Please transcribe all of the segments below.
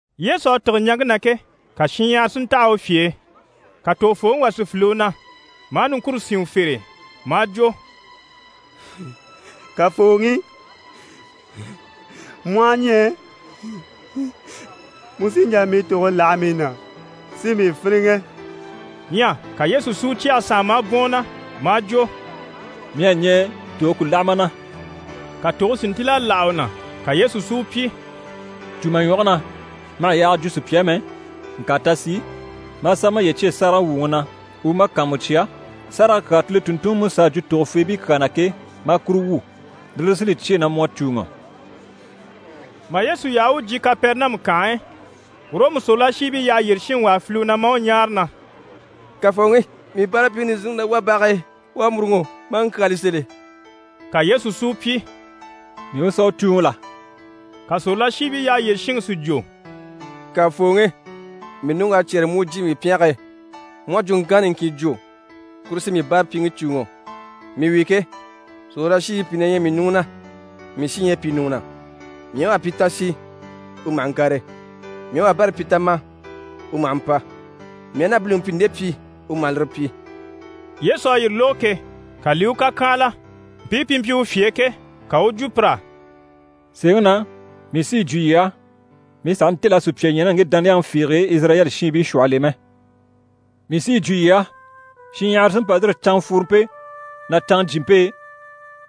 Yesu à tîge ɲaŋke na ke, ka shinɲyahara si ntaha u fye e. Ka tògofooŋi wà si file u na maa niŋkure sín u fere e maa jwo: «Kafooŋi, mu aha ɲɛɛ, mu sí n‑jà mii tòge láha mii na si mii fíniŋɛ.» Ɲyɛ ka Yesu si u cyɛge sànha maa bwɔ̀n u na maa jwo: «Mii à ɲɛɛ, tòge ku láha ma na!» Ka tòge si ntíl'a láha u na. Ka Yesu si u pyi: «Cû ma ɲwɔge na, ma hà yaaga jwo sùpya á mɛ, ŋka ta sì, maa sà maye cyêe sáragawwuŋi na u u ma kàanmucya, sárage kyaa Kile tùnntunŋiMusa à jwo tògofeebii kyaa na ke, maa kuru wwû. Lire li sí li cyêe na mu à cùuŋɔ.» Mà Yesu yaha u u jyè Kapɛrɛnamu kànhe e, Ɔrɔmu sòrolashiibii yyaha yyére shinŋi wà à file u na maa u ɲáare na: «Kafooŋi, mii báarapyiŋi nizinniŋi na wá bage e. U à mûruŋɔ, maa ŋkyaali sèl'e.» Ka Yesu si u pyi: «Mii u sà u cùuŋɔ la?» Ka sòrolashiibii yyaha yyére shinŋi si jwo: «Kafooŋi, mii ɲùŋk'à cyɛ́rɛ mu u jyè mii pyɛnge e. Mu aha jwuŋkanŋa niŋkin jwo, kuru sí mii báarapyiŋi cùuŋɔ. Mii wi ke, sòrolashiibii pìi na ɲyɛ mii ɲùŋɔ na, mii sí ɲyɛ pìi ɲùŋɔ na. Mii aha wà pyi “Ta sì” u maha ŋkàre. Mii aha wabɛrɛ pyi “Ta ma” u maha mpa. Mii aha na biliŋi pyi “Nde pyi” u maha lire pyi.» Yesu à yire lógo ke, ka li i u kàkyanhala. Mpii pi mpyi u fye e ke, ka u u jwo pir'á: «Sèeŋi na mii sí yi jwo yii á, mii sàha ntêl'a sùpya ɲya ná ŋge dániyaŋi fiige e Izirayɛli shiinbii shwɔhɔl'e mɛ! Mii sí yi jwo yii á, shinɲyahara sí raa yîri canŋafworompe ná canŋajyimpe e,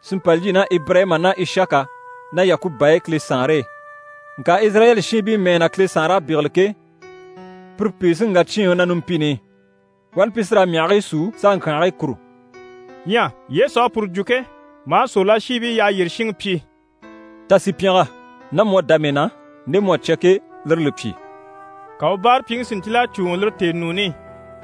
si mpa lyî ná Ibirayima ná Ishaka ná Yakuba e Kile Saanre e. Ŋka Izirayɛli shiinbii mɛɛ na Kile Saanre à bégele ke, pire pìi sí n‑wà cyíinŋi na numpini i. Wani pi sí raa myahigii súu s'a ŋkyànhigii kùru.» Ɲyɛ Yesu à puru jwo ke, maa sòrolashiibii yyaha yyére shinŋi pyi: «Ta sì pyɛngɛ. Ná mu à dá mii na, nde mu à cya ke, lire li pyi.» Ka u báarapyiŋi si ntíl'a cùuŋɔ lire tèenuuni i.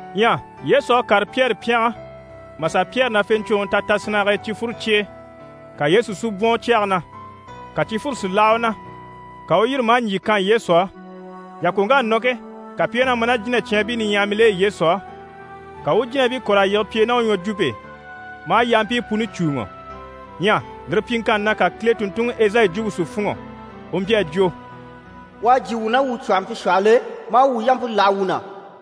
Ɲyɛ Yesu à kàre Pyɛri pyɛngɛ mà sà Pyɛri nafeɲcwoŋi ta tasinnage e cifwuro cye e. Ka Yesu si bwɔ̀n u cyɛge na, ka cifwure si láha u na. Ka u u yîri, maa ɲjyì kan Yesu á. Yàkoŋk'à nɔ ke, ka pi i wá na ma ná jínacyaanbii niɲyahamil'e Yesu á. Ka u u jínabii kɔ̀r'a yige pi e ná u ɲwɔjwumpe e, maa yampii puni cùuŋɔ. Ɲyɛ lire pyiŋkanni na, ka Kile tùnntunŋi Ezayi jwumpe si fûnŋɔ, u mpyi a jwo: «U à jyè wuu ná wuu cwɔ̀hɔmpe shwɔhɔl'e, maa wuu yampe láha wuu na.»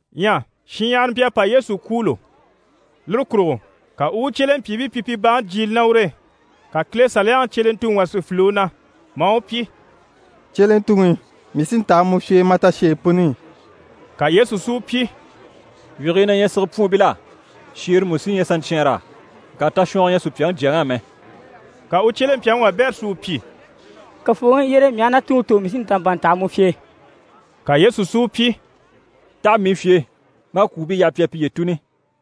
Ɲyɛ shinɲyahara mpyi a pa Yesu kwûulo, lire kurugo ka u u u cyelempyiibii pyi pi baŋi jyiile ná ur'e. Ka Kile Saliyaŋi cyelentuŋi wà si file u na maa u pyi: «Cyelentuŋi, mii sí n‑taha mu fye e ma tasheyi puni i.» Ka Yesu si u pyi: «Wyigii na ɲyɛ sigepwuunbil'á, shèere mú sí ɲyɛ saɲcyɛɛnr'á. Ŋka tashwɔngɔ ɲyɛ Supyaŋi Jyaŋi á mɛ.» Ka u cyelempyaŋi wabɛrɛ si u pyi: «Kafooŋi, yyére, mii aha na tuŋi tò, mii sí n‑ta n‑pa n‑taha mu fye e.» Ka Yesu si u pyi: «Taha mii fye e, maa kwùubii yaha pi a piye tùni.»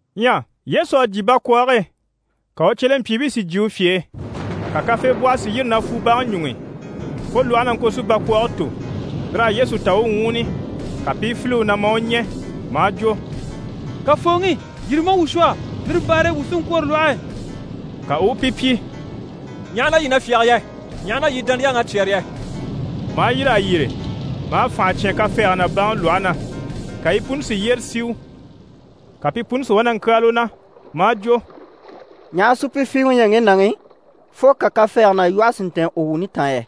Ɲyɛ Yesu à jyè bakwɔɔge e, ka u cyelempyiibii si jyè u fye e. Ka kafeebwɔhɔ si yîri na fwu baŋi ɲuŋ'i, fo lwɔhe na ŋko si bakwɔɔge tò. Lir'à Yesu ta u u ŋwúuni. Ka pi i file u na, maa u ɲɛ̀ maa jwo: «Kafooŋi, yîri maa wuu shwɔ, lire baare e wuu sí n‑kwôro lwɔhe e.» Ka u u pi pyi: «Ɲaha na yii na fyáge yɛ? Ɲaha na yii dániyaŋ'à cyɛ́rɛ yɛ?» Maa yîr'a yyére maa fànha cyán kafɛɛge ná baŋi lwɔhe na. Ka yi puni si yyére siu! Ka pi puni si wá na ŋkyáali u na, maa jwo: «Ɲaha supyifiiwe u ɲyɛ ŋge nàŋi, fo ka kafɛɛge ná lwɔhe si ntɛ̀ɛn u wuuni taan yɛ?»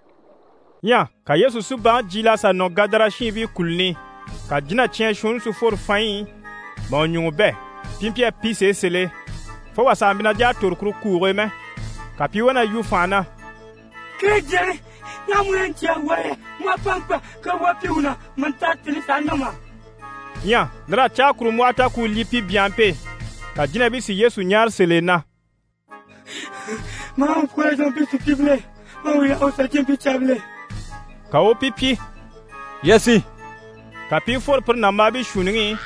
Ɲyɛ ka Yesu si baŋi jyiil'a sà nɔ Gadara shiinbii kùluni i. Ka jínacyaan shuunni si fworo fanɲyi i mà u ɲùŋɔ bɛ̂. Pi mpyi a pi sèe sèl'e, fo wà sàha mpyi na jà a tòro kuru kuuge e mɛ. Ka pi i wá na yu fànha na: «Kile Jyaŋi, ɲaha mu ɲyɛ na ɲcaa wuu á yɛ? Mu à pa mpa kawaa pyi wuu na mà ta tèni sàha nɔ mà?» Ɲyɛ lir'à caakurumbwɔhɔ ta ku u lyî pi byanhampe e. Ka jínabii si Yesu ɲáare sèl'e na: «Mu aha wuu kɔ̀r'a yige mpii sùpyiibil'e, ma a wuu yaha wuu sà jyè mpii caabil'e.» Ka u u pi pyi: «Yii a sì.» Ka pi i fworo pire nàmbaabii shuunniŋi i,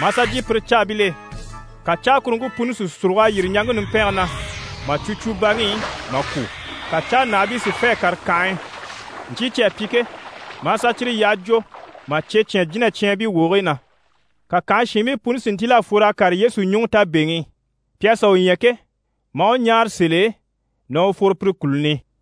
maa sà jyè pire caabil'e, ka caakuruŋke puni si sùrug'a yîri ɲaŋke numpɛnge na, mà cwo cwo baŋi i mà kwû. Ka cáanahabii si fê a kàre kànhe e, ɲcyii cyi à pyi ke, maa sà cyire yyaha jwo, mà cye cyán jínacyaanbii wogigii na. Ka kànhe shiinbii puni si ntíl'a fwor'a kàre Yesu ɲùŋɔ tabeŋi i. Pi à sà u ɲya ke, maa u ɲáare sèl'e na u fworo pire kùluni i.